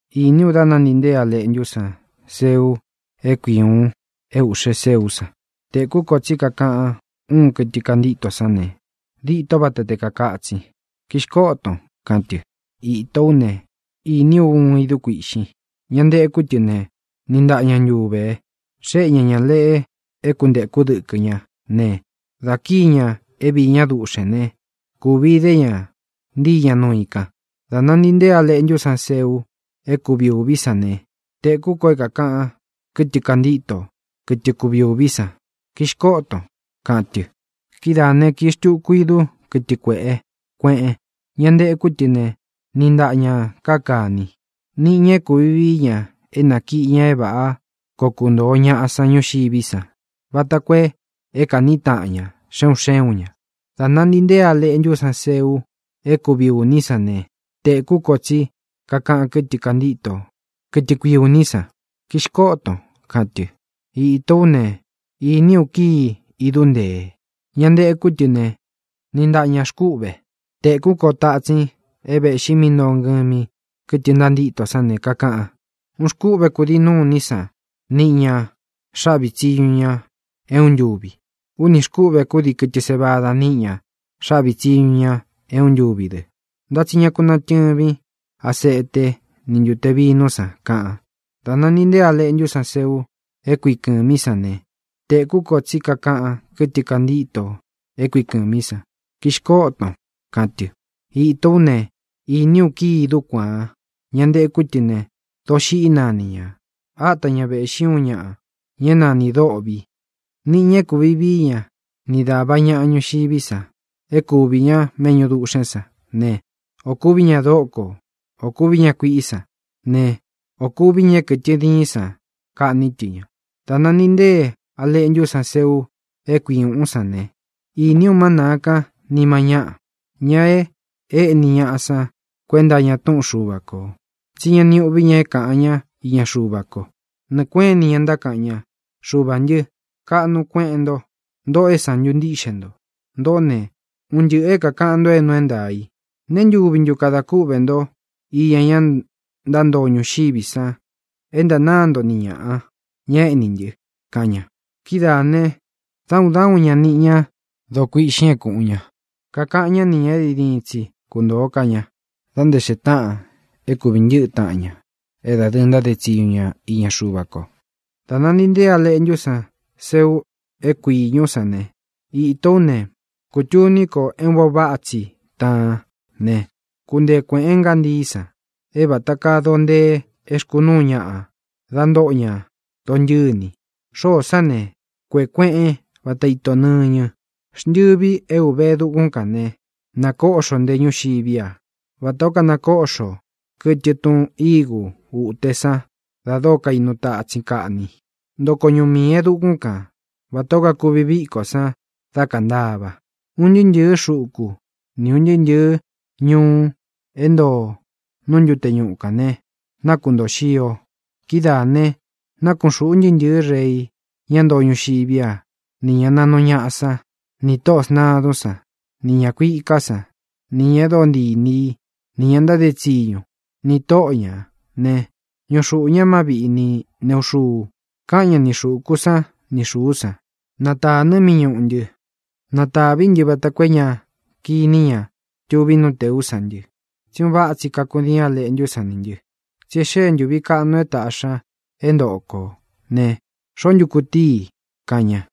Īní u dá nāntii nteé A Leꞌntú san seu é kui ūun é ūꞌxe séú san. Tēkú ko tsí kakaꞌan uun kɨtɨ kantíto sán ne, dîtó vata te kākatsin: —¡Kixkoton! —kaꞌan tɨ. Ītó u ne, īní u uun idú kuīꞌxin. Ña ntekú tɨ ne, niꞌi ntaꞌa ña ntuvē. Xéꞌe ña ñā leꞌe é kuntēkú dɨkɨ ñá ne, dā kíi ña é viī ñá duꞌxēn né, kūvi idé ña ntíi ña nuu i kān. Dā nantii nteé A Leꞌntú san seu é kui ūví san ne, tēkú ko é kākaꞌan kɨtɨ kantíto, kɨtɨ kuvi ūví san: —¡Kixkoton! —kaꞌan tɨ. Kidáā né, kīi xtuku idú, kɨtɨ kuēꞌe kueꞌen. Ña ntekú tɨ ne, niꞌi ntaꞌa ñā káa kāni. Níꞌi ñā e kúvi vií ña é nākiꞌi ña é vāꞌá koo kuntōo ñaꞌa san ñuxiví san, vata koo é kāꞌní taꞌan ña, xe un xé un ña. Dā nantii nteé A Leꞌntú san seu é kui ūní san ne, tēkú ko tsí kakaꞌan kɨ́tɨ kantíto, kɨtɨ kui ūní san: —¡Kixkoton! —kaꞌan tɨ. Ītó u ne, īní u kíi idú ntee. Ña ntekú tɨ ne, niꞌi ntaꞌa ña xkúꞌve. Tēkú ko tatsin é vēꞌxi mí ntoo ngɨmi kɨtɨ ntantíto sán ne, kakaꞌan: —Uun xkúꞌvē kúdii nuní san niꞌi ña xāꞌví tsiñu ñā é uun ntūvi. Únī xkúꞌvē kúdii kɨtɨ sévada níꞌi ñā xáꞌvi tsiñu ñā é uun ntūvi dɨ, ntá tsi ña ku natɨ̄vín aseté ni ntūte vinú san —kaꞌan. Dā nantii nteé A Leꞌntú san seu é kui kɨ̄mí san ne, tēkú ko tsí kakaꞌan kɨtɨ kantíto é kui kɨ̄mí san: —¡Kixkoton! —kaꞌan tɨ. Ītó u ne, īní u kíi idú kuāan. Ña ntekú tɨ ne, Doxiꞌí nani ñā. Áta ña vēꞌxí uun ñaꞌa, ña é nanī Dôꞌvi. Nīꞌi ña é kūvi vií ña ni dāva ñaꞌa ñuxiví san é kuví ña méꞌñu duꞌxēn sán ne, ō kuví ña doko, ō kuví ña kuiꞌí san ne, o kuví ña é kɨtɨ diín san kaꞌní tɨ ña. Dā nantii nteé A Leꞌntú san seu é kui ūꞌún san ne, īní u má nāa kan nima ñáꞌa, ña e éꞌni ñaꞌa san kuenta iña túꞌun Xuva kō, tsí ña ni uꞌví ña é kāꞌan ñá iña Xuva ko. Nɨɨ̄ kueꞌén ini ña ntákaꞌan ña: —Xuvā ntɨ́, kaꞌnu kueꞌen nto. Ntōꞌo é sāntu ntíꞌxe nto. Ntōꞌó ne, un ntɨꞌɨ̄ é kākaꞌan nto é nuu é ntaā i. ¿Nēe ntúvi ntu kada kúꞌvē nto iña ña ntántoo ñuxiví san é ntānáa nto ni ñāꞌa, ña éꞌní ntɨ? —kaꞌan ña. Kidáā ne, dá un dá un ña niꞌi ña doo kuiꞌxin é kūꞌun ña. Kakaꞌan ñá ni ñā é diin diín tsi kuntōo ká ña, da nté xee táꞌan é kūví ntɨꞌɨ taꞌan ña é dadɨɨ ntáde tsiñu ña iña Xuva ko. Dā nantii nteé A Leꞌntú san seu é kui īñú san ne, ītó u ne, kutūní ko é un vaꞌa váꞌa tsi taan ne, kuntee kuēꞌén ngantií san, é vata kaa doo ntee é xkūꞌún ñaꞌa dá ntoo ña dontɨ́ni. Xóō sán ne, kukuēꞌe kueꞌen váta ito nɨ̄ñɨ. Xntɨvi é ūve e dukún kān ne, nakóꞌxo nté ñuxiví a, vatā ó kanakoꞌxo kɨtɨ tun igu uté san da dóo kainu tatsin kaꞌni. Ntoko ñuꞌu miī e dukún kan, vatā ó kakuvi vikó san dá kāntava. Un ntɨɨ́ ntɨ̄ɨ́ xuku ni ūn ntɨɨ́ ntɨ̄ɨ́ ñuꞌu é ntoo nú ntute ñuꞌu kān ne, nakuntoó xio. Kidáā ne, nakuꞌun xūꞌu ntɨɨ́ ntɨ̄ɨ́ rei, ñá ntoo ñuxiví a, nī ña naꞌnu ñaꞌa sán, nī tóꞌō sntadún san, nī ña kuiká san, nī ña e dóo ntii inī í, nī ña ntáde tsiñu, nī tóꞌo ñā ne, ñúꞌu xuꞌū ñá mâví ni nēꞌu xuu. Káꞌan ña ni xūku sán ni xūú san: —¡Na tānɨ mí ñuꞌu ntɨ. Na tāví ntɨ vata koo é ña kiní ña tuví nú tēú san ntɨ, tsí un váꞌa tsi kakudiin A Leꞌntú san nī ntɨ! Tsí e xee ntúvi kaꞌnu é tāꞌxi ña é ntōꞌo ko ne, ¿xoó ntu kutíi i? —kaꞌan ña.